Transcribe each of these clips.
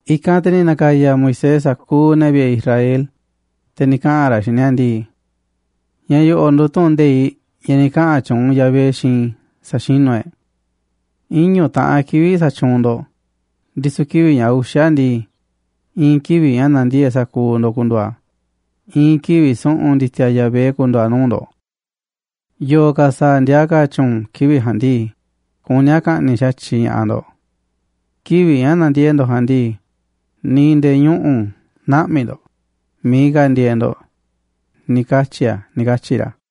I̱kanꞌ te̱ ni̱ na̱ka̱ya̱ Moisés sa̱kuuꞌ ne̱ vi̱ꞌe̱ Israel, te̱ ni̱ kaꞌa̱n ra̱ xiinꞌ ni̱a̱ ndii: ―Ña̱ yo̱ꞌo̱ꞌ nduuꞌ tu̱ꞌu̱n nde̱iꞌ ña̱ ni̱ kaꞌa̱n tyuunꞌ Yahvé xiinꞌ i̱ sa̱xinu̱ e̱ꞌ. Iñu̱ taꞌan kivi̱ꞌ sa̱tyuunꞌ ndo̱ꞌ, ndisu̱ kivi̱ꞌ ña̱ uxa̱ ndii, i̱i̱n kivi̱ꞌ ña̱ na̱ndiee̱ꞌ sa̱kuuꞌ ndo̱ꞌ ku̱ndu̱u̱ a̱, i̱i̱n kivi̱ꞌ su̱ꞌu̱n ndi̱ti̱a̱ Yahvé ku̱ndu̱u̱ a̱ nuu̱ꞌ ndo̱ꞌ. Yo̱o̱ ka̱ sa̱a̱ ndiaa ka̱ tyu̱u̱n kivi̱ꞌ ja̱a̱nꞌ ndii, kuní a̱ ka̱ꞌni̱ꞌ xa̱tyiꞌ ña̱ꞌaꞌ ndo̱ꞌ. Kivi̱ꞌ ña̱ nandiee̱ꞌ ndo̱ꞌ ja̱a̱nꞌ ndii, ni̱ nde̱e̱ ñuꞌu̱ nä̱ꞌmi̱ ndo̱ꞌ miiꞌ ka̱ ndieeꞌ ndo̱ꞌ, ni̱ katyi̱ a̱ ―ni̱ katyi̱ ra̱.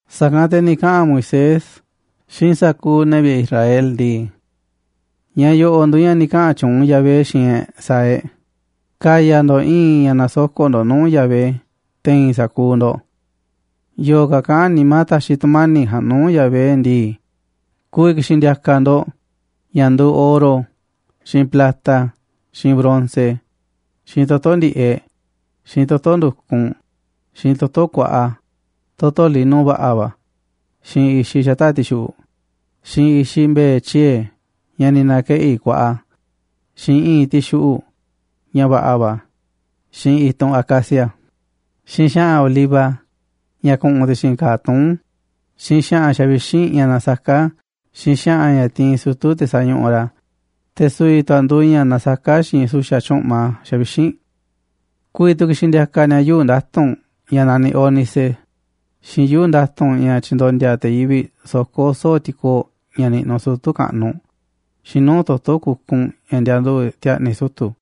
Sa̱kanꞌ te̱ ni̱ kaꞌa̱n Moisés xiinꞌ sa̱kuuꞌ ne̱ vi̱ꞌe̱ Israel ndii: ―Ña̱ yo̱ꞌo̱ꞌ nduuꞌ ña̱ ni̱ kaꞌa̱n tyuunꞌ Yahvé xiinꞌ e̱ꞌ sa̱a̱ e̱ꞌ. Ka̱ya̱ ndo̱ꞌ i̱i̱n ña̱ na̱soko̱ꞌ ndo̱ꞌ nuu̱ꞌ Yahvé te̱i̱n sa̱kuuꞌ ndo̱ꞌ. Yo̱o̱ ka̱ kaꞌán nimá ta̱xi̱ tu̱mani̱ꞌ ja̱a̱nꞌ nuu̱ꞌ Yahvé ndii, ku̱vi̱ ki̱xi̱n ndi̱a̱ka̱ ndo̱ꞌ ña̱ nduuꞌ oro xiinꞌ plata xiinꞌ bronce, xiinꞌ toto̱ ndi̱ꞌeꞌ, xiinꞌ toto̱ ndu̱kunꞌ, xiinꞌ toto̱ kuaꞌa, toto̱ lino va̱ꞌa̱ va̱, xiinꞌ i̱xiꞌ xata̱ꞌ ti̱xuꞌu̱ꞌ, xiinꞌ i̱i̱nꞌ mbe̱e̱ tyiee̱, ña̱ ni̱ na̱keꞌi̱ kuaꞌa, xiinꞌ i̱i̱nꞌ ti̱xiꞌu̱ꞌ, ña̱ va̱ꞌa̱ va̱, xiinꞌ i̱tunꞌ acacia, xiinꞌ xa̱ꞌa̱n oliva, ña̱ ku̱ꞌu̱n ti̱xi̱n ka̱a̱ tuún, xiinꞌ xa̱ꞌa̱n xavixínꞌ ña̱ nasaká xiinꞌ xa̱ꞌa̱n ña̱ tiinꞌ sutu̱ te̱ sañuꞌuꞌ ra̱, te̱ su̱vi̱ tu̱ a̱ nduuꞌ ña̱ nasaká xiinꞌ su̱xa̱ tyu̱ꞌma xavixínꞌ. Ku̱vi̱ tu̱ ki̱xi̱n ndi̱a̱ka̱ ni̱a̱ yuu̱ꞌ nda̱tu̱nꞌ ña̱ naniꞌ ónice, xiinꞌ yuu̱ꞌ nda̱tu̱nꞌ ña̱ tyindondia te̱ yivi̱ꞌ soko̱ soo̱ꞌ ti̱koo̱ꞌ ña̱ niꞌnuꞌ sutu̱ kaꞌnuꞌ, xiinꞌ nuu̱ꞌ toto̱ kukunꞌ ña̱ ndianduꞌu̱ꞌ ti̱a̱ꞌni̱ sutu̱ꞌ.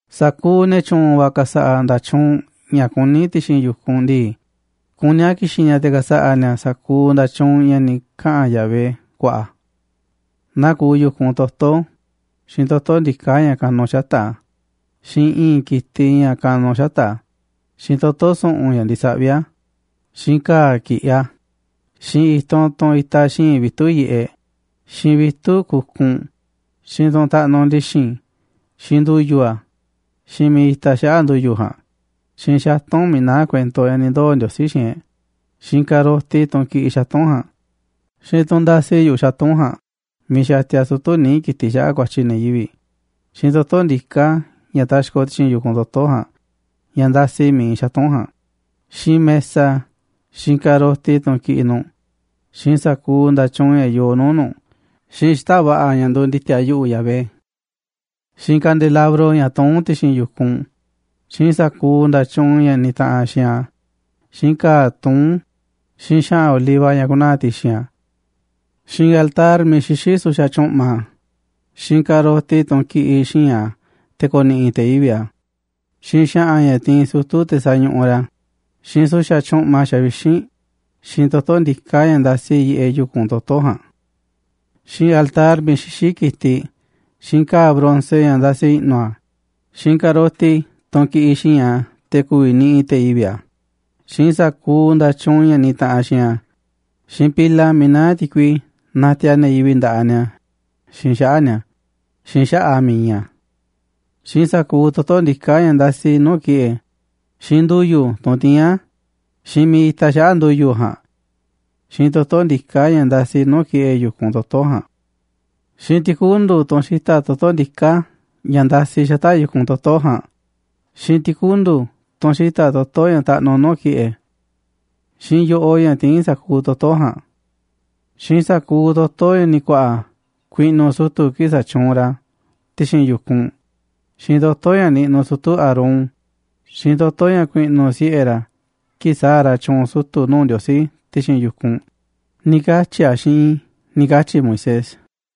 ’Sa̱kuuꞌ ne̱ tyu̱u̱n va̱ ka̱sa̱ꞌa̱ nda̱tyuunꞌ ña̱ kuní ti̱xi̱n yu̱kunꞌ ndii, kuní a̱ ki̱xi̱n ni̱a̱ te̱ ka̱sa̱ꞌa̱ ni̱a̱ sa̱kuuꞌ nda̱tyuunꞌ ña̱ ni̱ kaꞌa̱n Yahvé ku̱a̱ꞌa̱. Naa kuuꞌ yu̱kunꞌ toto̱, xiinꞌ toto̱ ndiká ña̱ kanu xata̱ꞌ a̱, xiinꞌ i̱i̱nꞌ ki̱tiꞌ ña̱ kanuꞌ xata̱ꞌ a̱, xiinꞌ toto̱ su̱ꞌu̱n ña̱ ndisaꞌví a̱, xiinꞌ ka̱a̱ ki̱ꞌiꞌ a̱, xiinꞌ i̱tunꞌ, tunꞌ itaꞌ xi̱i̱nꞌ vitu̱ꞌ yiꞌeꞌ, xiinꞌ vitu̱ꞌ kukunꞌ, xiinꞌ tunꞌ taꞌnuꞌ ndi̱xi̱n, xiinꞌ ndu̱yu̱ a̱, xiinꞌ miiꞌ itaꞌ xaꞌa̱ꞌ ndu̱yu̱ ja̱a̱nꞌ, xiinꞌ xatu̱nꞌ miiꞌ naá kuento ña̱ ni̱ ndoo̱ Ndiosí xiinꞌ e̱ꞌ, xiinꞌ ka̱roti, tunꞌ kiꞌiꞌ xatu̱nꞌ ja̱a̱nꞌ, xiinꞌ tunꞌ ndasi yu̱ꞌuꞌ xatu̱nꞌ ja̱a̱nꞌ, miiꞌ xatia sutu̱ níiꞌ ki̱tiꞌ xaꞌa̱ꞌ ku̱a̱tyi̱ ne̱ yivi̱ꞌ, xiinꞌ toto̱ ndiká ña̱ taxkoꞌ ti̱xi̱n yu̱kunꞌ toto̱ ja̱a̱nꞌ, ña̱ ndasi miiꞌ iinꞌ xatu̱nꞌ ja̱a̱nꞌ, xiinꞌ mesa, xiinꞌ ka̱roti, tunꞌ kiꞌiꞌ nu̱ꞌ, xiinꞌ sa̱kuuꞌ nda̱tyuunꞌ ña̱ yoo nuu̱ꞌ nu̱ꞌ, xiinꞌ xita̱ꞌ va̱ꞌa̱ ña̱ nduuꞌ ndi̱ti̱a̱ Yahvé, xiinꞌ kandelabro ña̱ tuún ti̱xi̱n yu̱kunꞌ, xiinꞌ sa̱kuuꞌ nda̱tyuunꞌ ña̱ nitaꞌanꞌ xiinꞌ a̱, xiinꞌ ka̱a̱ tuún, xiinꞌ xa̱ꞌa̱n oliva ña̱ ku̱naa̱ ti̱xi̱n a̱, xiinꞌ altar miiꞌ xixí su̱xa̱ tyu̱ꞌma, xiinꞌ ka̱roti tunꞌ kiꞌiꞌ xi̱i̱nꞌ a̱ te̱ ko̱ni̱ꞌi̱ te̱ yivi̱ꞌ a̱, xiinꞌ xa̱ꞌa̱n ña̱ tiinꞌ sutu̱ te̱ sañuꞌuꞌ ra̱, xiinꞌ su̱xa̱ tyu̱ꞌma xavixínꞌ, xiinꞌ toto̱ ndiká ña̱ ndasi yiꞌeꞌ yu̱kunꞌ toto̱ ja̱a̱nꞌ, xiinꞌ altar miiꞌ xixí ki̱tiꞌ, xiinꞌ ka̱a̱ bronce ña̱ ndasi i̱ꞌnu̱ a̱, xiinꞌ ka̱roti tunꞌ kiꞌiꞌ xi̱i̱nꞌ a̱ te̱ ku̱vi̱ niꞌiꞌ te̱ yivi̱ꞌ a̱, xiinꞌ sa̱kuuꞌ nda̱tyuunꞌ ña̱ nitaꞌanꞌ xiinꞌ a̱, xiinꞌ pila miiꞌ naá ti̱kui natiaꞌ ne̱ yivi̱ꞌ nda̱ꞌaꞌ ni̱a̱ xiinꞌ xaꞌa̱ꞌ ni̱a̱, xiinꞌ xaꞌa̱ꞌ a̱ miiꞌ iinꞌ a̱, xiinꞌ sa̱kuuꞌ toto̱ ndiká ña̱ ndasi nuu̱ꞌ ki̱ꞌe̱, xiinꞌ ndu̱yu̱, tunꞌ tiín a̱, xiinꞌ miiꞌ itaꞌ xaꞌa̱ꞌ ndu̱yu̱ ja̱a̱nꞌ, xiinꞌ toto̱ ndiká ña̱ ndasiꞌ nuu̱ꞌ ki̱ꞌe̱ yu̱kunꞌ toto̱ ja̱a̱nꞌ, xiinꞌ ti̱kundu̱, tunꞌ xita̱ꞌ toto̱ ndiká ña̱ ndasiꞌ xata̱ꞌ yu̱kunꞌ toto̱ ja̱a̱nꞌ, xiinꞌ ti̱kundu̱, tunꞌ xita̱ꞌ toto̱ ña̱ taꞌnuꞌ nuu̱ꞌ ki̱ꞌe̱, xiinꞌ yo̱ꞌoꞌ ña̱ tiín sa̱kuuꞌ toto̱ ja̱a̱nꞌ, xiinꞌ sa̱kuuꞌ toto̱ ña̱ ni̱ ku̱a̱ꞌa̱ ku̱i̱ꞌnu̱ sutu̱ kii̱ꞌ sa̱tyuunꞌ ra̱ ti̱xi̱n yu̱kunꞌ, xiinꞌ toto̱ ña̱ niꞌnuꞌ sutu̱ Aarón, xiinꞌ toto̱ ña̱ ku̱i̱ꞌnu̱ siꞌe̱ ra̱ kii̱ꞌ sa̱a̱ ra̱ tyu̱u̱n sutu̱ nuu̱ꞌ Ndiosí ti̱xi̱n yu̱kunꞌ, ni̱ katyi̱ a̱ xiinꞌ i̱ ―ni̱ katyi̱ Moisés.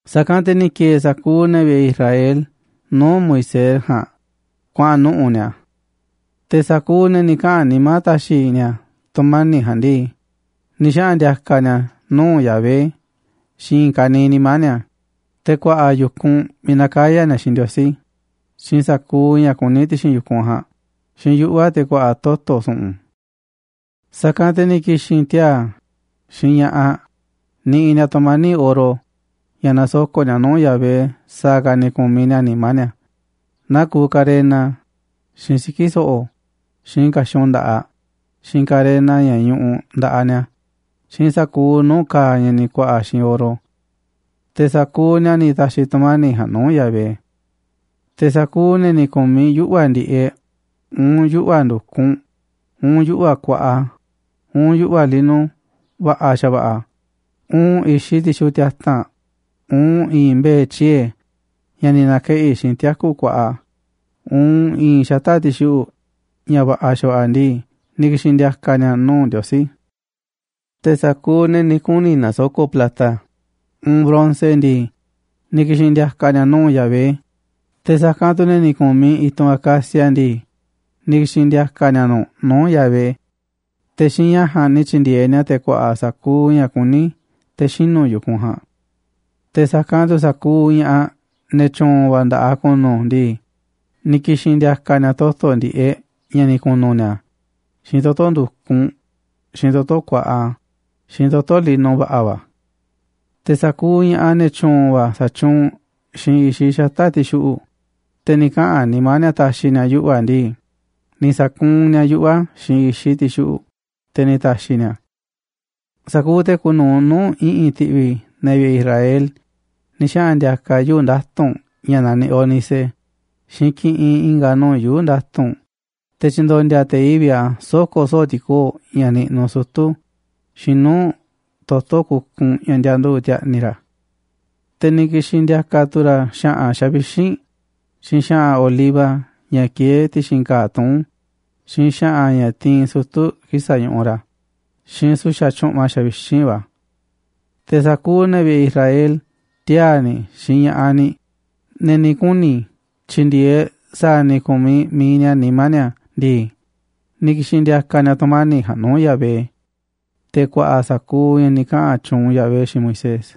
Sa̱kanꞌ te̱ ni̱ ki̱e̱e̱ sa̱kuuꞌ ne̱ vi̱ꞌe̱ Israel nuu̱ꞌ Moisés ja̱a̱nꞌ kuaꞌa̱n nuꞌu̱ꞌ ni̱a̱. Te̱ sa̱kuuꞌ ne̱ ni̱ kaꞌa̱n nimá ta̱xi̱ ni̱a̱ tu̱mani̱ꞌ ja̱a̱nꞌ ndii, ni̱ xaꞌa̱n ndi̱a̱ka̱ ni̱a̱ a̱ nuu̱ꞌ Yahvé xiinꞌ i̱i̱n ka̱niiꞌ nimá ni̱a̱, te̱ ku̱a̱ꞌa̱ yu̱kunꞌ miiꞌ na̱kaya̱ ni̱a̱ xiinꞌ Ndiosí, xiinꞌ sa̱kuuꞌ ña̱ kuní ti̱xi̱n yu̱kunꞌ ja̱a̱nꞌ, xiinꞌ yuꞌva̱ te̱ ku̱a̱ꞌa̱ toto̱ su̱ꞌu̱n. Sa̱kanꞌ te̱ ni̱ ki̱xi̱n tiaa̱ xiinꞌ ña̱ꞌaꞌ niꞌiꞌ ni̱a̱ tu̱mani̱ꞌ oro, ña̱ na̱soko̱ꞌ ni̱a̱ nuu̱ꞌ Yahvé sa̱a̱ ka̱ ni̱ ku̱miꞌ ni̱a̱ nimá ni̱a̱, naa kuuꞌ ka̱rena, xiinꞌ siki̱ so̱ꞌo̱, xiinꞌ ka̱xun nda̱ꞌaꞌ, xiinꞌ ka̱rena ña̱ ñuꞌuꞌ nda̱ꞌaꞌ ni̱a̱, xiinꞌ sa̱kuuꞌ nuu̱ꞌ ka̱a̱ ña̱ ni̱ ku̱a̱ꞌa̱ xiinꞌ oro. Te̱ sa̱kuuꞌ ni̱a̱ ni̱ ta̱xi̱ tu̱mani̱ꞌ ja̱a̱nꞌ nuu̱ꞌ Yahvé. Te̱ sa̱kuuꞌ ne̱ ni̱ ku̱miꞌ yuꞌva̱ ndi̱ꞌeꞌ, uun yuꞌva̱ ndu̱kunꞌ, uun yuꞌva̱ kuaꞌa, uun yuꞌva̱ lino va̱ꞌa̱ xa̱va̱ꞌa̱, uun i̱xiꞌ ti̱xuꞌu̱ꞌ tiata̱nꞌ, uun i̱i̱nꞌ mbe̱e̱ tyiee̱ ña̱ ni̱ na̱keꞌi̱ xiinꞌ tiaku̱ kuaꞌa, uun i̱i̱n xata̱ꞌ ti̱xuꞌu̱ꞌ ña̱ va̱ꞌa̱ xa̱va̱ꞌa̱ ndii, ni̱ ki̱xi̱n ndi̱a̱ka̱ ni̱a̱ nuu̱ꞌ Ndiosí. Te̱ sa̱kuuꞌ ne̱ ni̱ kuni̱ na̱soko̱ꞌ plata, uun bronce ndii, ni̱ ki̱xi̱n ndi̱a̱ka̱ ni̱a̱ nuu̱ꞌ Yahvé, te̱ sa̱kanꞌ tu̱ ne̱ ni̱ ku̱miꞌ i̱tunꞌ acacia ndii, ni̱ ki̱xi̱n ndi̱a̱ka̱ ni̱a̱ nu̱ꞌ nuu̱ꞌ Yahvé, te̱ xiinꞌ ña̱ ja̱a̱nꞌ ni̱ tyi̱ndi̱e̱eꞌ ni̱a̱ te̱ ku̱a̱ꞌa̱ sa̱kuuꞌ ña̱ kuní te̱ xinu̱ yu̱kunꞌ ja̱a̱nꞌ. Te̱ sa̱kanꞌ tu̱ sa̱kuuꞌ ña̱ꞌaꞌ ne̱ tyu̱u̱n va̱ nda̱ꞌaꞌ ku̱nu̱ ndii, ni̱ ki̱xi̱n ndi̱a̱ka̱ ni̱a̱ toto̱ ndi̱ꞌeꞌ ña̱ ni̱ ku̱nu̱ ni̱a̱, xiinꞌ toto̱ ndu̱kunꞌ, xiinꞌ toto̱ kuaꞌa, xiinꞌ toto̱ lino va̱ꞌa̱ va̱. Te̱ sa̱kuuꞌ ña̱ꞌaꞌ ne̱ tyu̱u̱n va̱ sa̱tyuunꞌ xiinꞌ i̱xiꞌ xata̱ꞌ ti̱xuꞌu̱ꞌ, te̱ ni̱ kaꞌa̱n nimá ni̱a̱ ta̱xi̱ ni̱a̱ yuꞌva̱ ndii, ni̱ sa̱kuunꞌ ni̱a̱ yuꞌva̱ xiinꞌ i̱xiꞌ ti̱xuꞌu̱ꞌ, te̱ ni̱ ta̱xi̱ ni̱a̱ a̱. Sa̱kuuꞌ te̱ kuuꞌ nu̱uꞌ nuu̱ꞌ i̱ꞌi̱n ti̱ꞌvi̱ ne̱ vi̱ꞌe̱ Israel ni̱ xaꞌa̱n ndi̱a̱ka̱ yuu̱ꞌ nda̱tu̱nꞌ ña̱ naniꞌ ónice, xiinꞌ kiꞌinꞌ i̱nga̱ nuu̱ꞌ yuu̱ꞌ nda̱tu̱nꞌ te̱ tyi̱ndo̱ndi̱a̱ te̱ yivi̱ꞌ a̱ soko̱ soo̱ꞌ ti̱koo̱ꞌ ña̱ niꞌnuꞌ sutu̱, xiinꞌ nuu̱ꞌ toto̱ kukunꞌ ña̱ ndianduꞌu̱ꞌ ti̱a̱ꞌni̱ ra̱. Te̱ ni̱ ki̱xi̱n ndi̱a̱ka̱ tu̱ ra̱ xa̱ꞌa̱n xavixínꞌ, xiinꞌ xa̱ꞌa̱n oliva ña̱ kieé ti̱xi̱n ka̱a̱ tuún, xiinꞌ xa̱ꞌa̱n ña̱ tiinꞌ sutu̱ kii̱ꞌ sañuꞌuꞌ ra̱, xiinꞌ su̱xa̱ tyu̱ꞌma xavixínꞌ va̱. Te̱ sa̱kuuꞌ ne̱ vi̱ꞌe̱ Israel tiaa̱ ni̱ xiinꞌ ña̱ꞌaꞌ ni̱, ne̱ ni̱ kuni̱ tyi̱ndi̱e̱eꞌ sa̱a̱ ni̱ ku̱miꞌ mi̱iꞌ ni̱a̱ nimá ni̱a̱ ndii, ni̱ ki̱xi̱n ndi̱a̱ka̱ ni̱a̱ tu̱mani̱ꞌ ja̱a̱nꞌ nuu̱ꞌ Yahvé, te̱ ku̱a̱ꞌa̱ sa̱kuuꞌ ña̱ ni̱ kaꞌa̱n tyuunꞌ Yahvé xiinꞌ Moisés.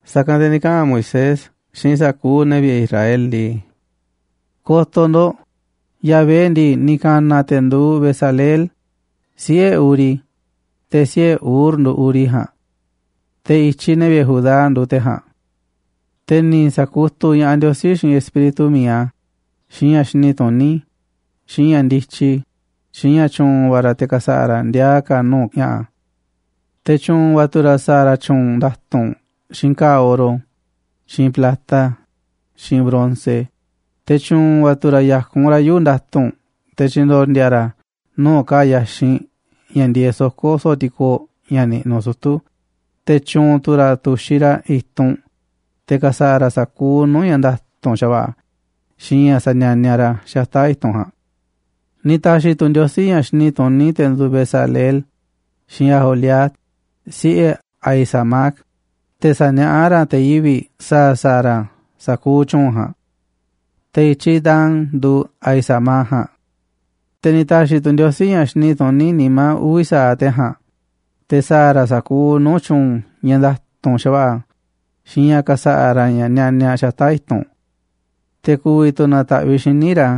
Sa̱kanꞌ te̱ ni̱ kaꞌa̱n Moisés xiinꞌ sa̱kuuꞌ ne̱ vi̱ꞌe̱ Israel ndii: ―Ko̱to̱ ndo̱ꞌ, Yahvé ndii, ni̱ ka̱na̱ a̱ te̱ nduuꞌ Bezaleel, siꞌe̱ Uri, te̱ siꞌe̱ Hur nduuꞌ Uri ja̱a̱nꞌ. Te̱ i̱tyiꞌ ne̱ vi̱ꞌe̱ Judá nduuꞌ te̱ ja̱a̱nꞌ. Te̱ ni̱ sa̱kutuꞌ ña̱ꞌaꞌ Ndiosí xiinꞌ Espíritu mi̱iꞌ a̱, xiinꞌ ña̱ xini tuní, xiinꞌ ña̱ ndityi, xiinꞌ ña̱ tyu̱u̱n va̱ ra̱ te̱ ka̱sa̱ꞌa̱ ra̱ ndiaa ka̱ nuu̱ꞌ ña̱ꞌa̱. Te̱ tyu̱u̱n va̱ tu̱ ra̱ sa̱a̱ ra̱ tyuunꞌ nda̱tu̱nꞌ xiinꞌ ka̱a̱ oro, xiinꞌ plata, xiinꞌ bronce, te̱ tyu̱u̱n va̱ tu̱ ra̱ ya̱kun ra̱ yuu̱ꞌ nda̱tu̱nꞌ te̱ tyi̱ndo̱ndi̱a̱ ra̱ a̱ nuu̱ꞌ ka̱a̱ yaxinꞌ ña̱ ndieeꞌ soko̱ soo̱ꞌ ti̱koo̱ꞌ ña̱ niꞌnuꞌ sutu̱, te̱ tyu̱u̱n tu̱ ra̱ tu̱xiꞌ ra̱ i̱tunꞌ, te̱ ka̱sa̱ꞌa̱ ra̱ sa̱kuuꞌ nuu̱ꞌ ña̱ nda̱tu̱nꞌ xa̱va̱ꞌa̱, xiinꞌ ña̱ sanianiaꞌ ra̱ xata̱ꞌ i̱tunꞌ ja̱a̱nꞌ. Ni̱ ta̱xi̱ tu̱ Ndiosí ña̱ xini tuní te̱ nduuꞌ Bezaleel xiinꞌ Aholiab, siꞌe̱ Ahisamac, te̱ sa̱niaꞌá ra̱ te̱ yivi̱ꞌ sa̱a̱ sa̱a̱ ra̱ sa̱kuuꞌ tyu̱u̱n ja̱a̱nꞌ. Te̱ i̱tyiꞌ Dan nduuꞌ Ahisamac ja̱a̱nꞌ. Te̱ ni̱ ta̱xi̱ tu̱ Ndiosí ña̱ xini tuní nimá uvi̱ sa̱aꞌ te̱ ja̱a̱nꞌ te̱ sa̱a̱ ra̱ sa̱kuuꞌ nuu̱ꞌ tyu̱u̱n ña̱ nda̱tu̱nꞌ xa̱va̱ꞌa̱ xiinꞌ ña̱ ka̱sa̱ꞌa̱ ra̱ ña̱ nianiaꞌ xata̱ꞌ i̱tunꞌ. Te̱ ku̱vi̱ tu̱ na̱ta̱ꞌviꞌ xíniꞌ ra̱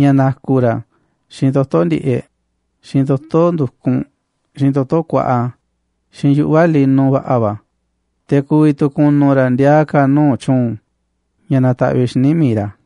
ña̱ na̱ku̱ ra̱ xiinꞌ toto̱ ndi̱ꞌeꞌ, xiinꞌ toto̱ ndu̱kunꞌ, xiinꞌ toto̱ kuaꞌa, xiinꞌ yuꞌva̱ lino va̱ꞌa̱ va̱, te̱ ku̱vi̱ tu̱ kunuꞌ ra̱ ndiaa ka̱ nuu̱ꞌ tyu̱u̱n, ña̱ na̱ta̱ꞌviꞌ xíniꞌ mi̱iꞌ ra̱.